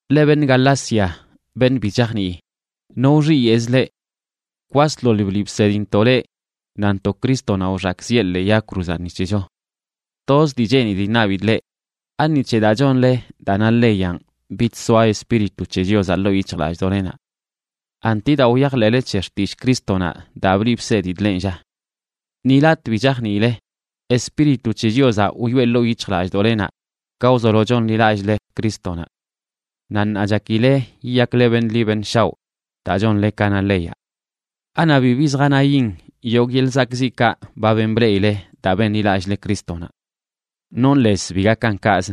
Leꞌ beṉꞌ Galacia, beṉꞌ bi chajnii, ¿no wxiyeꞌz leꞌ? Kwasḻoḻ bliꞌ bsedintoꞌ leꞌ nantoꞌ Crístonaꞌ wxakꞌziꞌe ḻee yag cruzaꞌ ni c̱hecho. Toz dii cheenidꞌ iṉabidꞌ leꞌ: ¿Ani c̱he daa chonle daa na leyanꞌ bidsoaꞌ Espíritu c̱he Chiozaꞌ ḻoo yic̱hjlallꞌdoꞌlenaꞌ? ¿Anti daa wyajḻeꞌle c̱he xtillꞌ Crístonaꞌ daa bliꞌ bsedidꞌ lenꞌ, lla? ¡Ni latꞌ bi chajniile! Espíritu c̱he Chiozaꞌ wyoꞌe ḻoo yic̱hjlallꞌdoꞌlenaꞌ ka wzolo chonḻilallꞌle Crístonaꞌ. Naꞌ ṉaa chakile yiyakle beṉꞌ ḻi beṉꞌ shaoꞌ daa chonle ka na leyaꞌ. ¿Anaꞌ bibi zjanayin yogꞌ yeḻꞌ zakꞌziꞌkaꞌ ba ben bleꞌile daa benḻilallꞌle Crístonaꞌ? Nonꞌ lez bi gakan kaꞌz.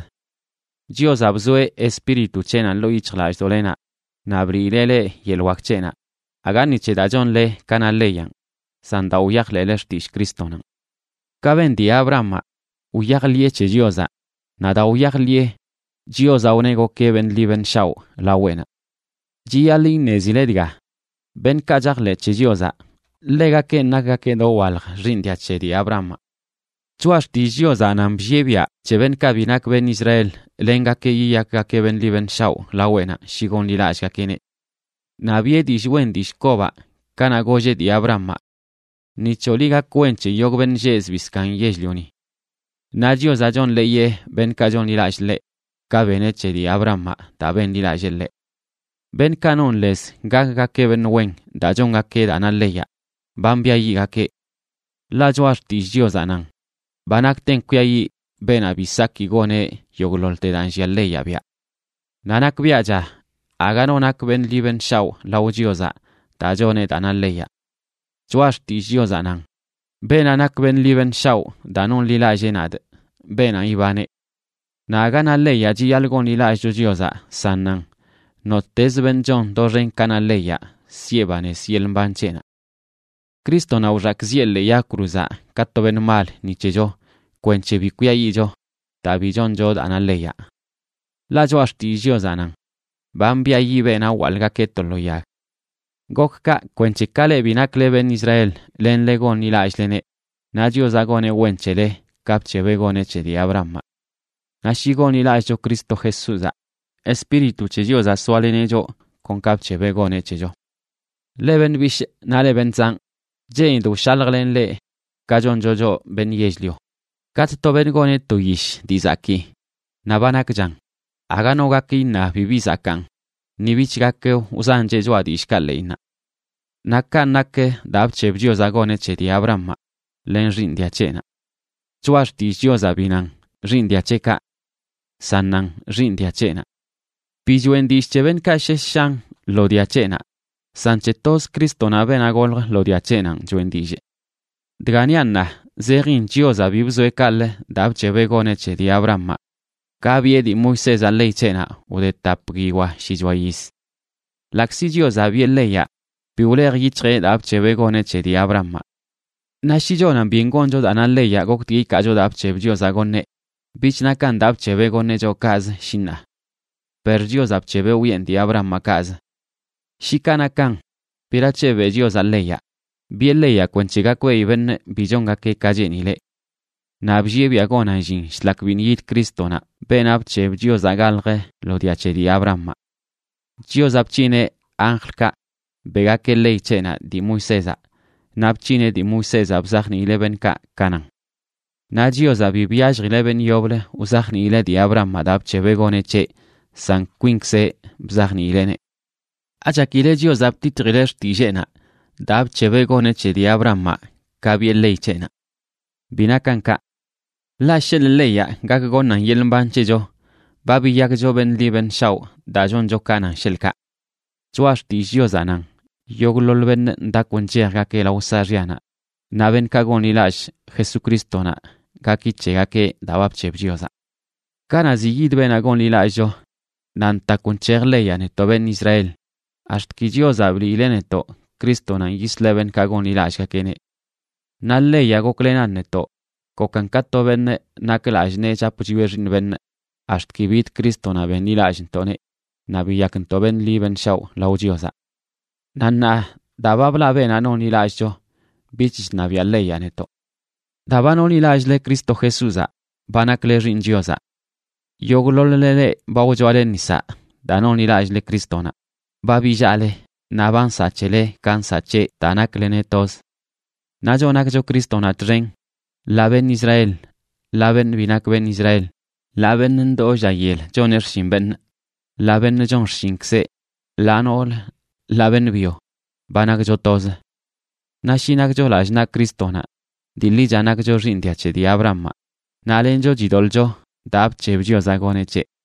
Chiozaꞌ bzoeꞌ Espíritu c̱heꞌnaꞌ ḻoo yic̱hjlallꞌdoꞌlenaꞌ naꞌ bliileꞌ leꞌ yeḻꞌ wak c̱heꞌnaꞌ, aga ni c̱he daa chonle ka na leyanꞌ, san daa wyajḻeꞌle xtillꞌ Crístonanꞌ. Ka ben dii Abrahamaꞌ, wyajḻiꞌe c̱he Chiozaꞌ, naꞌ daa wyajḻiꞌe, Chiozaꞌ wneꞌ gokeꞌ beṉꞌ ḻi beṉꞌ shaoꞌ laweꞌnaꞌ. Chiyaḻꞌ iṉezile dga: beṉꞌkaꞌ chajḻeꞌ c̱he Chiozaꞌ, ḻegakenꞌ nakgakeꞌ dowalj xiiṉ dia c̱he dii Abrahamaꞌ. Choꞌa Xtillꞌ Chiozaꞌ nan bllieꞌ biaꞌ c̱he beṉꞌkaꞌ bi nak beṉꞌ Israel lengakeꞌ yiyakgakeꞌ beṉꞌ ḻi beṉꞌ shaoꞌ laweꞌnaꞌ shi gonḻilallꞌgakeꞌneꞌ. Naꞌ biꞌe dillꞌ wen dillꞌ kobaꞌ kanaꞌ golleꞌ dii Abrahamaꞌ: “Ni c̱hoꞌ liꞌ gak wen c̱he yogꞌ beṉꞌ lleꞌ zbii zkaaṉ yell-lioni.” Naꞌ Chiozaꞌ chonḻeeyeꞌ beṉꞌkaꞌ chonḻilallꞌ ḻeꞌ, ka beneꞌ c̱he dii Abrahamaꞌ daa benḻilallee ḻeꞌ. Beṉꞌkaꞌ non lez gakgakeꞌ beṉꞌ wen daa chongakeꞌ daa na leyaꞌ, ba mbiayiꞌgakeꞌ. Ḻaꞌ Choꞌa Xtillꞌ Chiozaꞌ nan: “Ba nakten kwiayiꞌ beenaꞌ bi saki goneꞌ yogꞌḻoḻte daa nllia leyaꞌ biaꞌ.” Naꞌ nakbiaꞌcha aga no nak beṉꞌ ḻi beṉꞌ shaoꞌ lao Chiozaꞌ daa choneꞌ daa na leyaꞌ. Choꞌa Xtillꞌ Chiozaꞌ nan: “Beenaꞌ nak beṉꞌ ḻi beṉꞌ shaoꞌ daa nonḻilallee nadꞌ, beenanꞌ ibaneꞌ.” Naꞌ aga na leyaꞌ chiyaḻꞌ gonḻilallꞌcho Chiozaꞌ, san nan: “Nottezə beṉꞌ chon doxen ka na leyaꞌ siꞌe banez yeḻꞌ mban c̱heꞌnaꞌ.” Crístonaꞌ wxakꞌziꞌe ḻee yag cruzaꞌ ka to beṉꞌ mal ni c̱hecho kwenc̱he bi kwiayiꞌcho daa bi choncho daa na leyaꞌ. Ḻaꞌ Choꞌa Xtillꞌ Chiozaꞌ nan: “Ba mbiayiꞌ beenaꞌ wwaḻꞌgakeꞌ to lo yag.” Gok kaꞌ kwenc̱he ka leꞌ bi nakle beṉꞌ Israel lenle gonḻilallꞌleneꞌ, naꞌ Chiozaꞌ goneꞌ wen c̱hele ka bc̱hebeꞌ goneꞌ c̱he dii Abrahamaꞌ. Naꞌ shi gonḻilallꞌcho Cristo Jesúzaꞌ, Espíritu c̱he Chiozaꞌ soaleneꞌ choꞌ, kon ka bc̱hebeꞌ goneꞌ c̱hecho. Leꞌ beṉꞌ bishꞌ naꞌ leꞌ beṉꞌ zanꞌ, cheenidꞌ wshaljlenꞌ leꞌ ka choncho choꞌ beṉꞌ yell-lio: Katꞌ to beṉꞌ goneꞌ to yish dii zakii naꞌ ba nakchan, aga no gak iṉa bibi zakaan ni bich gak wzancheꞌ choꞌa dillꞌkaꞌ ḻeꞌinnaꞌ. Naꞌ kanꞌ nak daa bc̱heb Chiozaꞌ goneꞌ c̱he dii Abrahamaꞌ len xiiṉ dia c̱heꞌnaꞌ. Choꞌa Xtillꞌ Chiozaꞌ bi nan: “xiiṉ dia c̱heꞌkaꞌ”, san nan: “xiiṉ dia c̱heꞌnaꞌ”. Bi choeꞌn dillꞌ c̱he beṉꞌkaꞌ shesh shan lo dia c̱heꞌnaꞌ, san c̱he toz Crístonaꞌ, beenaꞌ golj lo dia c̱heꞌnanꞌ choꞌen dillꞌ. Dga niaꞌ ṉaa zejin Chiozaꞌ bi bzoeꞌ kaꞌlə daa bc̱hebeꞌ goneꞌ c̱he dii Abrahamaꞌ ka biꞌe dii Moisézaꞌ ley c̱heꞌnaꞌ wde tap guiyoa shichoa yiz. Ḻaꞌkzi Chiozaꞌ biꞌe leyaꞌ, bi wlej yic̱hjeꞌ daa bc̱hebeꞌ goneꞌ c̱he dii Abrahamaꞌ. Naꞌ shi chonan byen goncho daa na leyaꞌ goktgui ikaacho daa bc̱heb Chiozaꞌ goṉeꞌ, bich nakan daa bc̱hebeꞌ goṉeꞌ choꞌ kaꞌzə, shi ṉaa. Per Chiozaꞌ bc̱hebeꞌ wiꞌen dii Abrahamaꞌ kaꞌzə. Shi kaꞌ nakan, ¿berac̱he beꞌ Chiozaꞌ leyaꞌ? Biꞌe leyaꞌ kwenc̱he gakbeꞌi beṉꞌ bi chongakeꞌ ka cheenileꞌ. Naꞌ bllieꞌ biaꞌ gonan llin shlak biṉꞌ yid Crístonaꞌ, beenaꞌ bc̱heb Chiozaꞌ galjə lo dia c̱he dii Abrahamaꞌ. Chiozaꞌ bc̱hineꞌ anjlkaꞌ beꞌgakeꞌ ley c̱heꞌnaꞌ dii Moisézaꞌ, naꞌ bc̱hineꞌ dii Moisézaꞌ bzajniileꞌ beṉꞌkaꞌ ka nan. Naꞌ Chiozaꞌ bi byalljileꞌ beṉꞌ yoblə wzajniileꞌ dii Abrahamaꞌ daa bc̱hebeꞌ goneꞌ c̱heꞌ, san kwinkzeꞌ bzajniileꞌneꞌ. ¿Achakile Chiozaꞌ bititjileꞌ xtilleenaꞌ daa bc̱hebeꞌ goneꞌ c̱he dii Abrahamaꞌ ka biꞌe ley c̱heꞌnaꞌ? Bi nakan kaꞌ. Ḻaꞌ sheḻꞌ leyaꞌ gak goṉan yeḻꞌ mban c̱hecho, ba biyakcho beṉꞌ ḻi beṉꞌ shaoꞌ daa choncho ka nan, sheḻꞌkaꞌ. Choꞌa Xtillꞌ Chiozaꞌ nan yogꞌḻoḻ beṉꞌ ndakw nchejgakeꞌ lao saaxyanaꞌ, naꞌ beṉꞌkaꞌ gonḻilallꞌ Jesucrístonaꞌ gaki c̱hegakeꞌ daa ba bc̱heb Chiozaꞌ. Kanaꞌ ziꞌ yid beenaꞌ gonḻilallꞌcho, naꞌ ntakw nc̱hej leyaꞌ netoꞌ beṉꞌ Israel, ax̱t ki Chiozaꞌ bliileꞌ netoꞌ Crístonanꞌ yisleꞌ beṉꞌkaꞌ gonḻilallꞌgakeꞌneꞌ. Naꞌ leyaꞌ goklenan netoꞌ, gokan ka to beṉꞌ nak lallꞌ nee chap chwieꞌ xiiṉ beṉꞌ, ax̱t ki bid Crístonaꞌ benḻilallꞌntoꞌneꞌ naꞌ biyakntoꞌ beṉꞌ ḻi beṉꞌ shaoꞌ lao Chiozaꞌ. Naꞌ ṉaa daa ba blaꞌ beenaꞌ nonḻilallꞌcho, bich chṉabiaꞌ leyaꞌ netoꞌ. Daa ba nonḻilallꞌle Cristo Jesúzaꞌ, ba nakle xiiṉ Chiozaꞌ. Yogꞌḻoḻ-le, leꞌ ba wchoale nisaꞌ daa nonḻilallꞌle Crístonaꞌ, ba billaꞌle naꞌ ba nsaꞌ c̱hele ka nsaꞌ c̱heꞌ daa nakleneꞌ toz. Naꞌ choꞌ nakcho Crístonaꞌ txen, ḻaa beṉꞌ Israel, ḻaa beṉꞌ bi nak beṉꞌ Israel, ḻaa beṉꞌ ndoo lla yel choneꞌ xshin beṉꞌ, ḻaa beṉꞌ chon xshinkzeꞌ, ḻaa noolə, ḻaa beṉꞌ byo, ba nakcho toz. Naꞌ shi nakcho lallꞌ naꞌ Crístonaꞌ, dii ḻicha nakcho xiiṉ dia c̱he dii Abrahamaꞌ, naꞌ lencho chidoḻꞌcho daa bc̱heb Chiozaꞌ goneꞌ c̱heꞌ.